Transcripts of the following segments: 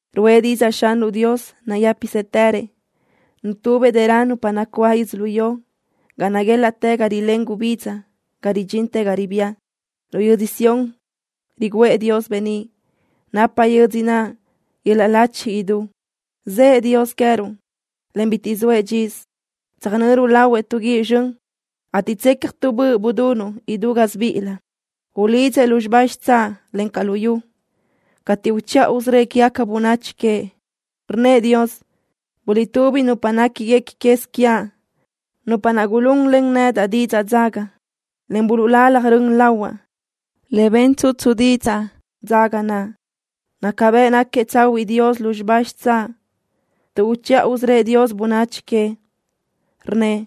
Ruʼë didzaʼ Xanruʼ Dios nayë́pisëtërëʼ. Nutubëʼ dërö nupa nacuáʼ yödzölió ga naguélaʼtë ga rilén gubidza ga ridxintë ga ribía. Lu yödzö Sión riguʼë Dios beníʼ. Napa yödzö naʼ yöl-laʼ lachi idú. Zëʼë Dios queë́ruʼ, en bitiʼ soëʼ dxisö. Tsöjnöru lahuëʼ tu guíʼ zxön, ateʼ tsecja tu böʼ budunuʼ idú gasibíʼilëʼ. Ulidzëʼ lúzxiba xitsáʼ, encaʼ luyú cateʼ uchiʼa usörö́ëʼ quégaca bönachi queëʼ. Rnnëʼ Dios: “Guliʼtúbi nupa néquiguequi quez quiaʼ, nupa naʼ gulunlen nedaʼ didzaʼ dzaga, en buluʼlalaj rön lahuaʼ le ben tsutsu didzaʼ dzaga naʼ.” Naca bëʼ náquiëʼ tsahuiʼ Dios lúzxiba xitsáʼ, tuʼ uchiʼa usörö́ëʼ Dios bönachi queëʼ. Rnnëʼ: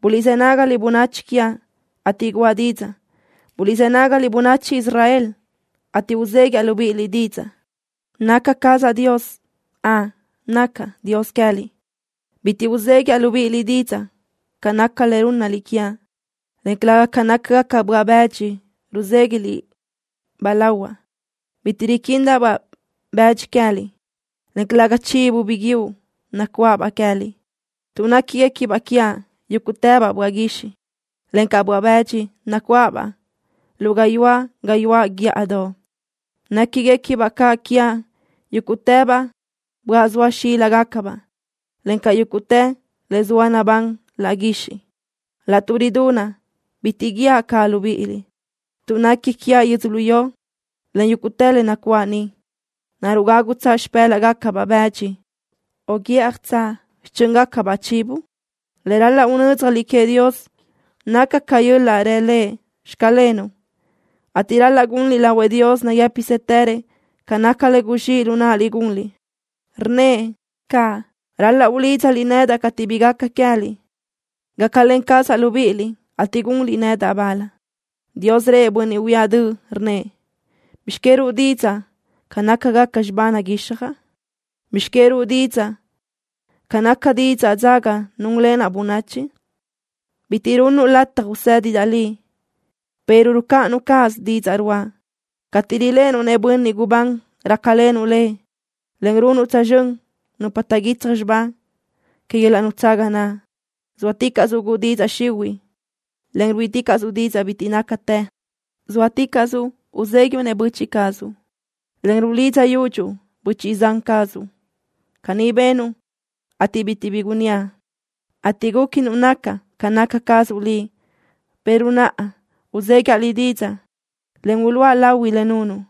“Buliʼzë nágaliʼ, bönachi quiaʼ, ateʼ guʼa didzaʼ. Buliʼzë́ nágaliʼ, bönachi Israel, ateʼ uzéguiaʼ libíʼiliʼ didzaʼ. Naca cazaʼ Dios. Ön, nacaʼ Dios queë́liʼ. Bitiʼ uzéguiaʼ libíʼiliʼ didzaʼ ca naca le rúnnaliʼ quiaʼ, en calëga ca nácagacabaʼ böaʼ bëdxi ruzéguiʼliʼ-baʼ lahuaʼ. Bitiʼ riquindaʼ-baʼ bëdxi queë́liʼ, en calëga chivo biguiúʼ nacuáʼabaʼ queë́liʼ, tuʼ néquigacabaʼ quiaʼ yúguʼtëbaʼ böaʼ guixiʼ, encaʼ böaʼ-bëdxi nacuáʼabaʼ lu gayuáʼ gayuáʼ guíʼadoʼ. Néquigacabaʼ caʼ quiaʼ yúguʼtëbaʼ böaʼ zoa xíligacabaʼ, encaʼ yúguʼtë le zoa nabán laʼ guixiʼ. Laʼtuʼ ridunaʼ bitiʼ guíaʼ caʼ libíʼiliʼ, tuʼ nequi quiaʼ yödzölió, encaʼ yúguʼtë le nacuáʼ niʼ. ¿Naruʼ gágutsaʼ xipë́laʼgacabaʼ bëdxi, o guíʼjatsaʼ xichö́ngacabaʼ chivo?” Le ral-laʼ unö́dzjaliʼ queëʼ Dios naca yöl-laʼ rë Lëʼ: “Xclenuʼ” ateʼ ral-laʼ gunliʼ lahuëʼ Dios nayë́pisëtërëʼ ca naca le guzxíʼ lu náʼaliʼ gunliʼ. Rnnëʼ caʼ: “Ral-laʼ ulídzaliʼ nedaʼ cateʼ bi gaca queë́liʼ. Gácalen cazaʼ libíʼiliʼ, ateʼ gunliʼ nedaʼ bal.” Dios rëʼ bönniʼ huíaʼ döʼ, rnnëʼ: “¿Bizx que ruʼu didzaʼ ca nácagaca xibá naguixjaʼ? ¿Bizx que ruʼu didzaʼ ca naca didzaʼ dzaga núnlenaʼ bönachi? Bitiʼ runnuʼ lataj usédidaʼ liʼ, pero rucáʼanuʼ cáʼasö didzaʼ ruáʼa. Cateʼ riléʼenuʼ-nëʼ bönniʼ gubán rácalenuʼ lëʼ, en runuʼ tsözxö́n nupa taʼguitsaj xibá que yöl-laʼ nutsaga naʼ. Zóaticaʼsuʼ guʼu didzaʼ xihuiʼ, en ruíʼiticaʼsuʼ didzaʼ bitiʼ nácatë. Zóaticaʼsuʼ uzéguiuʼ-nëʼ böchiʼ cazuʼ, en rudidzaʼ yudxuʼ böchiʼ-zan cazuʼ. Caní benuʼ, ateʼ bitiʼ bi gunníaʼ, ateʼ gúquinuʼ nacaʼ ca naca cazuʼ liʼ, pero naʼa uzéguiaʼ liʼ didzaʼ, en uluʼa lahui le nunuʼ.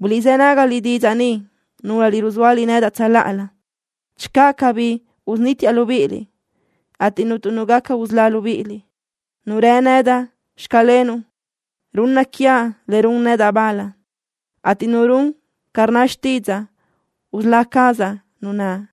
Buliʼzë́ nágaliʼ didzaʼ ni, núlöliʼ ruzóaliʼ nedaʼ tsöláʼalö. Channö cabí, usunítiaʼ libíʼiliʼ, ateʼ cuntu nu gaca usölá libíʼiliʼ. Nu rë nedaʼ: Xclenuʼ, runna quiaʼ le run nedaʼ bal, ateʼ nu run ca rnna xtídzaʼa, usölá cazaʼ nu naʼ.”